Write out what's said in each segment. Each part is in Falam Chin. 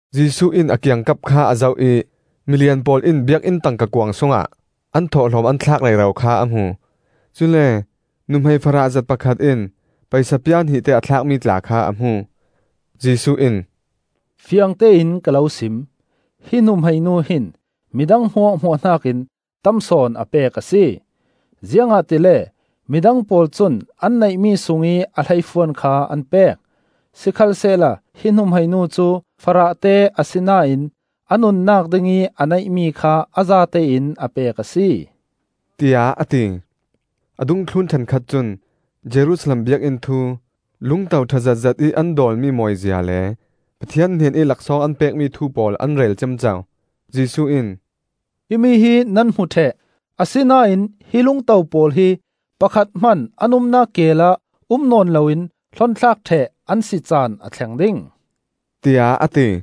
Jesuh in a kiangkap kha a zoh ih, milian pawl in Biakinn tangka kuang sungah an thawhlawm an thlak rero kha a hmu; cule nuhmei farah zet pakhat in paisa pia hnihte a thlakmi tla kha a hmu. Jesuh in, “Fiangtein ka lo sim: hi nuhmei nu hin midang hmuahhmuah hnakin tam sawn a pek a si. Ziangahtile midang pawl cun an neihmi sungih a hleifuan kha an pek; sikhalsehla hi nuhmei nu cu farahte asinain a nunnak dingih a neihmi kha a zatein a pek a si,” tiah a ti. A dungthlun ṭhenkhat cun Jerusalem Biakinn thu, lungto ṭha zetzet ih an dawlmi mawizia le Pathian hnenih laksawng an pekmi thu pawl an rel ciamco. Jesuh in, “Himi hi nan hmu ṭheh; asinain hi lungto pawl hi pakhat hman an umnak keel ah um nawn loin hlon thlak ṭheh an si caan a thleng ding,” tiah a ti.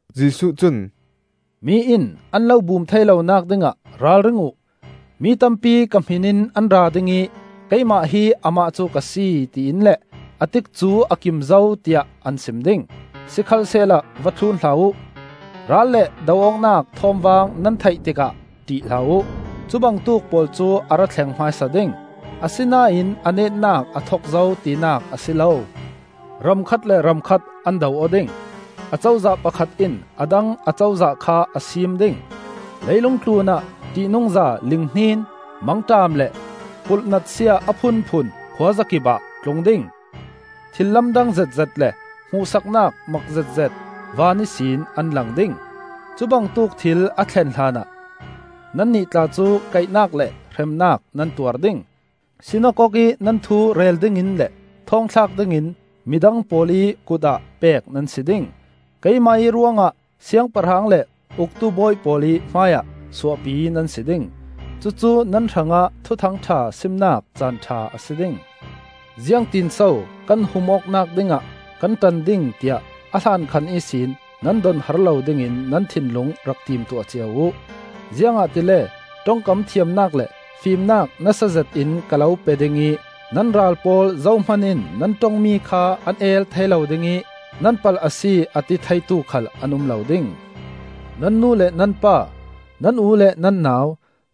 Jesuh cun, “Mi in an lo bum thei lonak dingah ralring uh; mi tampi ka hmin in an ra ding ih ‘Keimah hi Amah cu ka si,’ tiin le ‘A tikcu a kim zo,’ tiah an sim ding. Sikhalsehla va thlun hlah uh. Ral le do awknak thawmvang nan theih tikah ṭih hlah uh; cu bangtuk pawl cu a ra thleng hmaisa ding, asinain a netnak a thok zo tinak a si lo. “Ram khat le ram khat an do aw ding; Acozah pakhat in a dang Acozah kha a siim ding. Leilung tlun ah ṭihnungza linghnin mangṭam, le pulhnatsia a phunphun khuazakipah a tlung ding. Thil lamdang zetzet le hmuhsaknak mak zetzet van ihsin an lang ding. “Cubangtuk thil a thlen hlanah nannih tla cu kaihnak le hremnak nan tuar ding; sinakok i nan thu rel dingin le thawngthlak dingin midang pawl ih kut ah pek nan si ding. Keimah ih ruangah siangpahrang le uktu bawi pawl ih hmaiah suahpi nan si ding. Cucu nan hrangah Thuthang ṭha simnak caan ṭha a si ding. Ziangtin so kan hum awknak dingah kan ṭan ding tiah a hlankhan ihsin nan donhar lo dingin nan thinlung rak timtuah cia uh. Ziangahtile ṭongkam thiamnak le fimnak nasa zetin ka lo pe ding ih nan ral pawl zohman in nan ṭongmi kha an el thei lo ding ih nan palh a si, a ti theitu khal an um lo ding. Nan nu le nan pa, nan u le nan nau,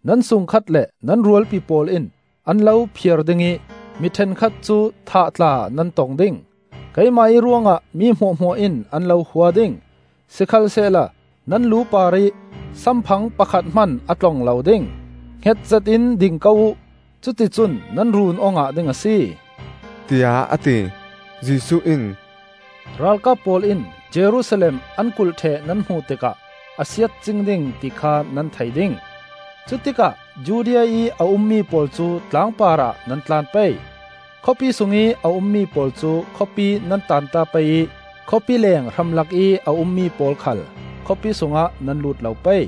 nan sungkhat le nan rualpi pawl in an lo phiar ding ih mi ṭhenkhat cu thah tla nan tong ding. Keimah ih ruangah mi hmuahhmuah in an lo hua ding. Sikhalsehla nan lu parih samphang pakhat hman a tlong lo ding. Hnget zetin ding ko uh; cuticun nan run aw ngah ding a si,” tiah a ti. Jesuh in, “Ralkap pawl in Jerusalem an kulh ṭheh nan hmuh tikah a siat cing ding ti kha nan thei ding. Cutikah Judea ih a ummi pawl cu tlang parah nan tlan pei; khawpi sungih a ummi pawl cu khawpi nan taanta pei ih khawpi leeng hramlak ih a ummi pawl khal khawpi sungah nan lut lo pei.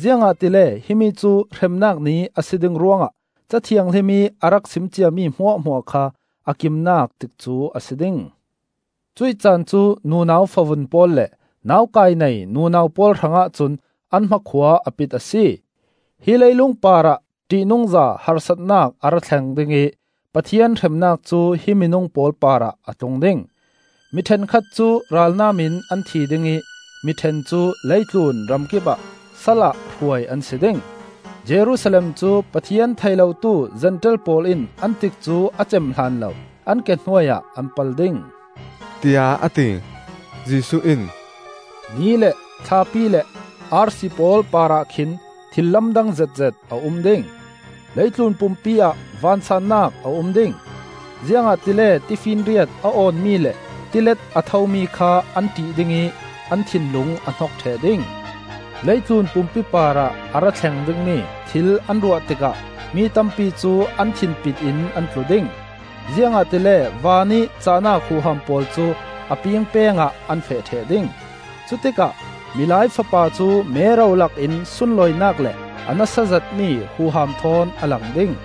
Ziangahtile himi cu ‘Hremnak Ni,’ a si ding ruangah Ca Thianghlim ih a rak sim ciami hmuahhmuah kha a kimnak tikcu a si ding. Cuih caan cu nunau favun pawl le naukai nei nunau pawl hrangah cun an hmakhua a pit a si! Hi leilung parah ṭihnungza harsatnak a ra thleng ding ih Pathian hremnak cu hi minung pawl parah a tlung ding. Mi ṭhenkhat cu ralnam in an thi ding ih mi ṭhen cu leitlun ramkipah salah hruai an si ding. Jerusalem cu Pathian thei lotu Zentail pawl in an tikcu a cem hlanlo an ke hnuai ah an pal ding,” tiah a ti. Jesuh in, “Ni le thlapi le arsi pawl parah khin thil lamdang zetzet a um ding. Leitlun pumpi ah vansaannak a um ding, ziangahtile tifinriat a awnmi le tilet a thomi kha an ṭih ding ih an thinlung a hnok ṭheh ding. Leitlun pumpi parah a ra thleng dingmi thil an ruah tikah mi tampi cu an thinpit in an tlu ding, ziangahtile vanih cahnak huham pawl cu a pingpeng ah an feh ṭheh ding. Cutikah Milai Fapa cu mero lakin sunlawinak le a nasa zetmi huham thawn a lang ding.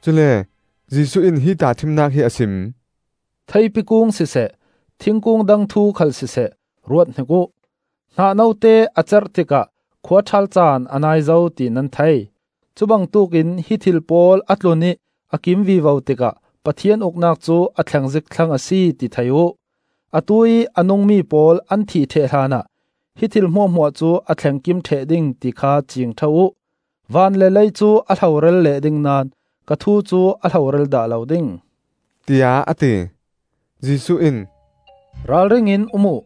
Cule Jesuh in hi tahṭhimnak hi a sim: “Theipi kung siseh, thingkung dang thu khal siseh, ruathnik uh. Hnah note a cerh tikah khuaṭhal caan a nai zo ti nan thei. Cu bangtuk in hi thil pawl a tlun ih a kim vivo tikah Pathian Uknak cu a thleng zik thlang a si, ti thei uh. Atuih a nungmi pawl an thih ṭheh hlanah hi thil hmuahhmuah cu a thleng kim ṭheh ding ti kha ciing ṭha uh. Van le lei cu a hloral leh ding naón ka thu cu a hloral dah lo ding,” tiah a ti. Jesuh in, “Ralring in um uh!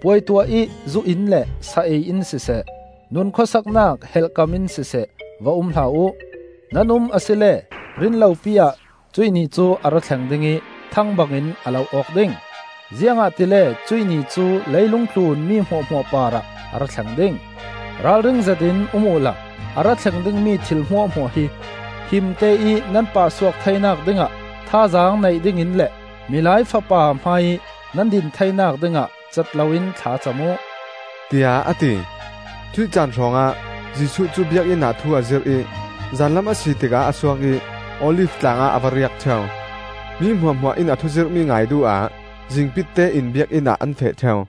Puai tuah ih zu in le sa ei in siseh, nun khuasaknak helhkam in siseh, va um hlah uh; nan um asile rin lopi ah cuih Ni cu a ra thleng ding ih, thang bangin a lo awk ding. Ziangahtile cuih Ni cu leilung tlun mi hmuahhmuah parah a ra thleng ding. Ralring zetin um uhla, a ra thleng dingmi thil hmuahhmuah hi himte ih nan pahsuak theinak dingah thazaang nei dingin le Milai Fapa hmaiih nan din theinak ding ah cat loin thla cam uh,” tiah a ti. Cuih caan hrawngah Jesuh cu Biakinn ah thu a zirh ih zanlam a si tikah a suak ih Olif tlang ah a va riak ṭheu. Mi hmuahhmuah in a thu zirhmi ngai duh ah zingpitte in Biakinn ah an feh ṭheu.